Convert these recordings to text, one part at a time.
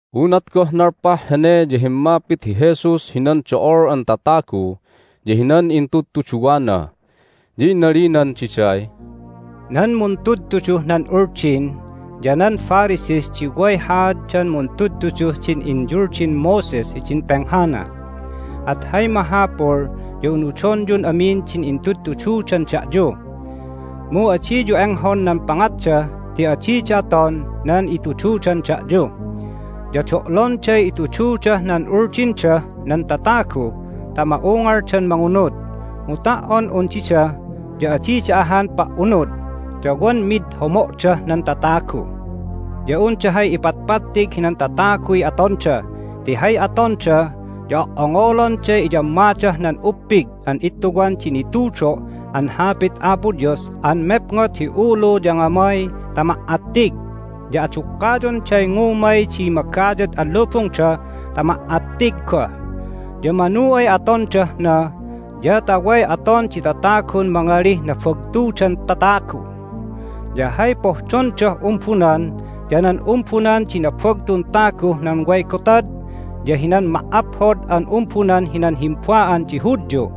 Unat goh nalpah hene ya himmapit hi Jesus hinan do'ol an tatagu ya hinan intudtuduwana, ya inalinan diday, "Nan muntudtuduh nan Uldin ya nan Pharisees di way haaddan muntudtuduh din inyuldin Moses hidin penghana. At hay mahapul ya unudonyun amin din intudtududan da'yu, mu adiyu enghon nan pangatda ti adida aton nan itududan da'yu. Ya do'londay itududah nan uldindah nan tatagu ta ma'ungaldan mangunud, mu ta"on un dida ya adida ahan pa"unud, ya wan mid homo'dah nan tatagu. Ya unda hay ipatpattig hinan tataguy atonda, ti hay atonda ya o"ongolonday iyammadah nan uppig an ittuwan di nitudo' an Hapit Apo Dios an mepngot hi ulu ya ngamay ta ma"attig, ya adukkayonday ngumay di magayad an lubungda ta ma"attig goh. Ya manu ay atondah na ya ta way aton di tatagun mangalih nabagtudan tatagu. Ya hay pohdondah umbunan ya nan umbunan di nabagtun taguh nan way gotad ya hinan ma"aphod an umbunan hinan himba'an di Hudyu.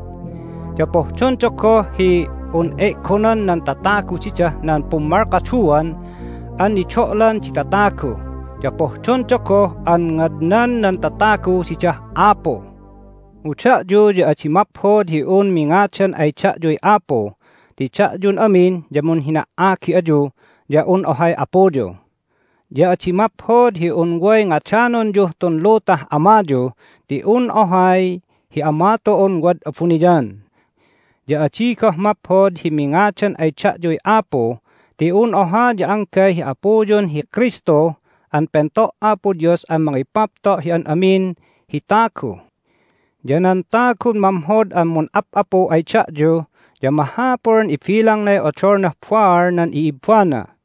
Ya pohdonda goh hi un e'gonan nan tatagu didah nan pummalkaduan an nido'lan di tatagu, ya pohdonda goh an ngadnan nan tatagu didah Apu. Mu da'yu ya adi maphod hi un mingadan ay da'yuy Apu ti da'yun amin ya munhina"agi ayu ya un ohay Apuyu. Ya adi maphod hi un way ngadanonyuh tun lutah amayu, ti un ohay hi Ama tu'un wad abuniyan. Ya adi goh maphod hi mingadan ay da'yuy Apu ti un oha ya anggay hi Apuyun hi Kristu an pento' Apo Dios an mangipapto' hi an amin hi tagu. Ya nan tagun mamhod an mun'ap'apu ay da'yu ya mahapul an ibilangnay odolnah baal nan i'ibbana.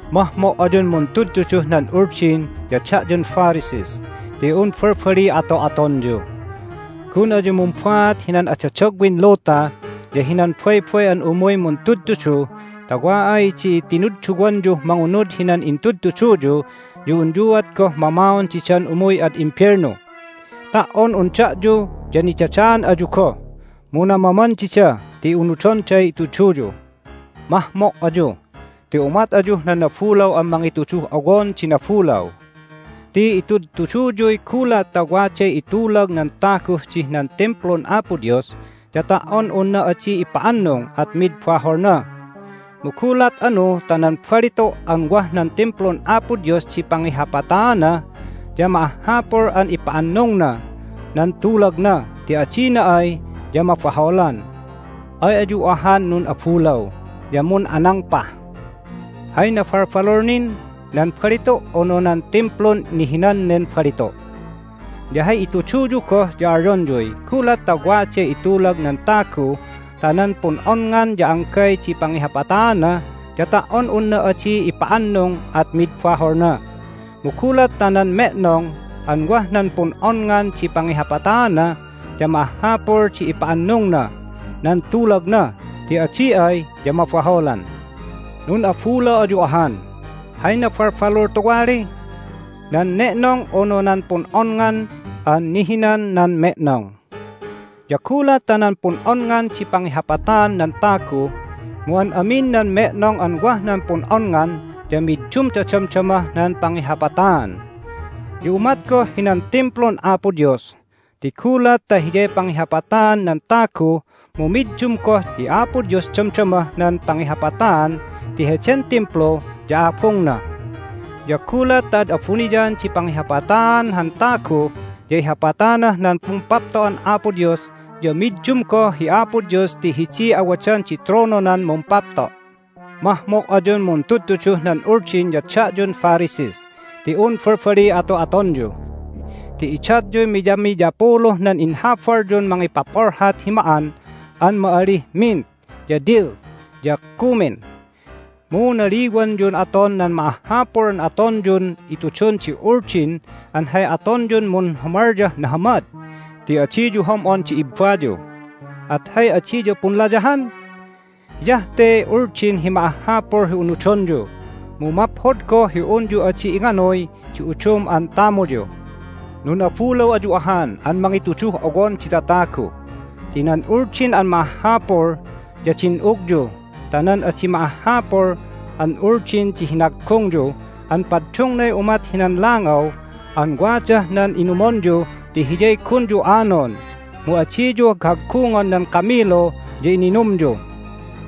Mahmo' ayun muntudtuduh nan Uldin ya da'yun Pharisees ti un balbaliy ato'atonyu! Gun ayu mumbaat hinan adadagwin luta ya hinan baybay an umuy muntudtudu ta wa ay di tinudduwanyuh mangunud hinan intudtuduyu ya unyuat goh mamaon didan umuy ad imbelnu! Ta"on un da'yu ya nidadaan ayu goh, mu namaman dida ti unudonday ituduyu. Mahmo' ayu! Ti umat ayuh nan nabulaw an mangituduh owon di nabulaw! Ti itudtuduyuy, Gulat ta waday itulag nan taguh dih nan Timplun Apo Dios ya ta"on unna adi ipa'annung at mid baholna. Mu gulat anu ta nan balitu' an wah nan Timplun Apo Dios di pangihapataana ya ma'ahhapul an ipa'annungna nan tulagna, ti adina ay ya mabaholan. Ay ayu ahan nun'abulaw ya mun'anangpah! Hay nabalbalul nin? Nan balitu', unu nan Timplun nihinan nen balitu'? Ya hay ituduyu goh ya alyonyuy, Gulat ta waday itulag nan tagu ta nan pun'onngan ya anggay di pangihapataana, ya ta"on unna adi ipa'annung at mid baholna. Mu gulat ta nan me'nong an wah nan pun'onngan di pangihapataana ya ma'ahhapul di ipa'annungna nan tulagna, ti adi ay ya mabaholan. Nun'abulaw ayu ahan! Hay nabalbalul tuwali? Nan ne'nong, unu nan pun'onngan an nihinan nan me'nong? Ya gulat ta nan pun'onngan di pangihapataan nan tagu, mu an amin nan me'nong an wah nan pun'onngan ya middumda damdamah nan pangihapataan. Ya umat goh hinan Timplun Apo Dios ti gulat ta hiyay pangihapataan nan tagu mu middum goh hi Apo Dios damdamah nan pangihapataan ti heden Timplu ya Abungna. Ya gulat ta ad abuniyan di pangihapataan han tagu ya ihapatanah nan Pumpapto'an Apo Dios ya middum goh hi Apo Dios ti hidiy awadan di trononan mumpapto'. Mahmo' ayun muntudtuduh nan Uldin ya da'yun Pharisees ti un balbaliy ato'atonyu! Ti idatyuy miyamiyapuluh nan inhabalyun mangipapolhat hi ma'an an ma'alih mint, ya dill, ya cumin. Mu naliwanyun aton nan ma'ahhapul an atonyun itudun di Uldin an hay atonyun munhumalyah nahamad ti adiyu hom'on di ibbayu, at hay adiyu punlayahan? Hiyah te Uldin hi ma'ahhapul hi unudonyu, mu maphod goh hi unyu adi inganuy di udum an tamuyu. Nun'abulaw ayu ahan an mangituduh owon di tatagu! Ti nan Uldin an ma'ahhapul ya din'ugyu ta nan adi ma'ahhapul an Uldin di hinaggungyu an paddungnay umat hinan langaw an wadah nan inumonyu ti hiyay gunyu anon, mu adiyu haghaggungon nan kamilu ya ininumyu!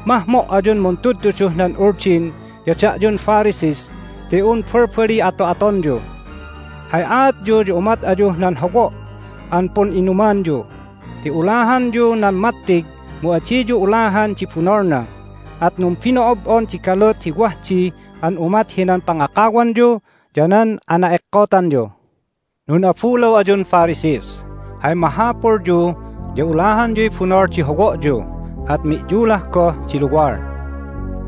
Mahmo' ayun muntudtuduh nan Uldin ya da'yun Pharisees ti un balbaliy ato'atonyu! Hay aatyu ya umat ayuh nan howo' an pun'inumanyu ti ulahanyu nan mattig, mu adiyu ulahan di bunolna, at numbino'ob'on di galut hi wah di an umat hinan pangakawanyu ya nan ana'ekkotanyu. Nun'abulaw ayun Pharisees! Hay mahapulyu ya ulahanyuy bunol di howo'yu, at mi'yulah goh di luwal!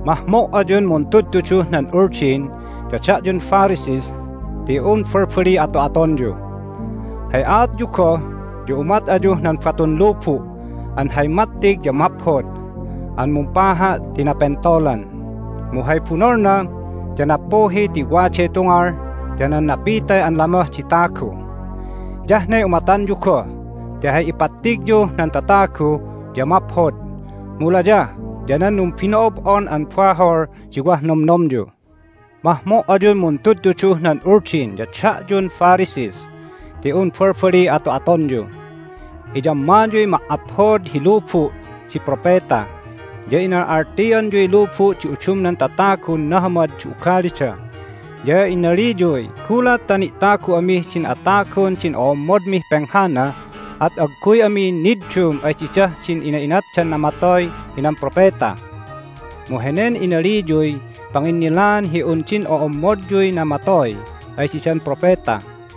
Mahmo' ayun muntudtuduh nan Uldin ya da'yun Pharisees ti un balbaliy ato'atonyu! Hay aatyu goh ya umat ayuh nan batun lubu' an hay mattig ya maphod an mumpaha' ti napentolan, mu hay bunolna ya nappuhi ti waday tungal ya nan napitay an lamoh di tagu! Hiyah ne umatanyu goh ti hay ipattigyuh nan tatagu ya maphod, mu layah ya nan numbino'ob'on an bahol di wah nomnomyu. Mahmo' ayun muntudtuduh nan Uldin ya da'yun Pharisees ti un balbaliy ato'atonyu! Iyammayuy ma"aphod hi lubu' di propeta, ya inal'altianyuy lubu' di udumnan tatagun nahamad di ugalida, ya inaliyuy, Gulat ta ni'tagu amih din atagun din o'ommodmih penghana at agguy ami niddum ay didah din ina'inatdan namatoy hinan propeta! Mu henen inaliyuy panginnilaan hi un din o'ommodyuy namatoy ay didan propeta!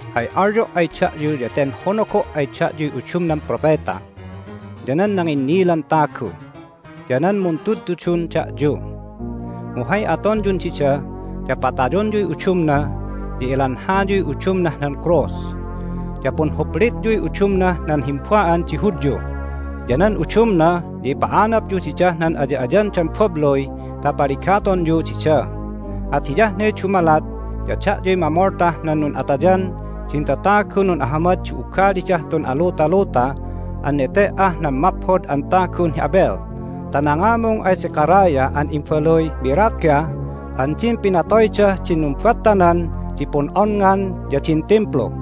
Hay alyo' ay da'yu ya ten honogo' ay da'yuy udumnan propeta, ya nan nanginnilan tagu, ya nan muntudtudun da'yu. Mu hay atonyun dida ya patayonyuy udumna, ya ilanhayuy udumnah nan krus, ya punhuplityuy udumnah nan himba'an di Hudyu, ya nan udumna ya ipa'anapyu didah nan aya'ayandan babluy ta paligatonyu dida. At hiyah ne dumalat ya da'yuy mamoltah nan nun'atayan din tatagun nun'ahamad di ugalidah tun alutaluta an nete"ah nan maphod an tagun hi Abel ta nangamung ay Zechariah an imbaluy Berakiah an din pinatoydah din numbattanan di pun'onngan ya din Timplu.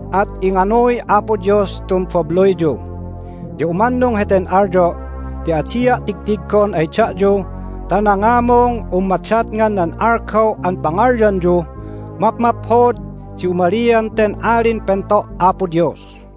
At inganuy Apo Dios tun babluyyu! Ya umannung heten alyo' ti adia' tigtiggon ay da'yu ta nangamung un madatngan nan algaw an pangalyanyuh, Mapmaphod di umalian ten Alin Pento' Apo Dios!"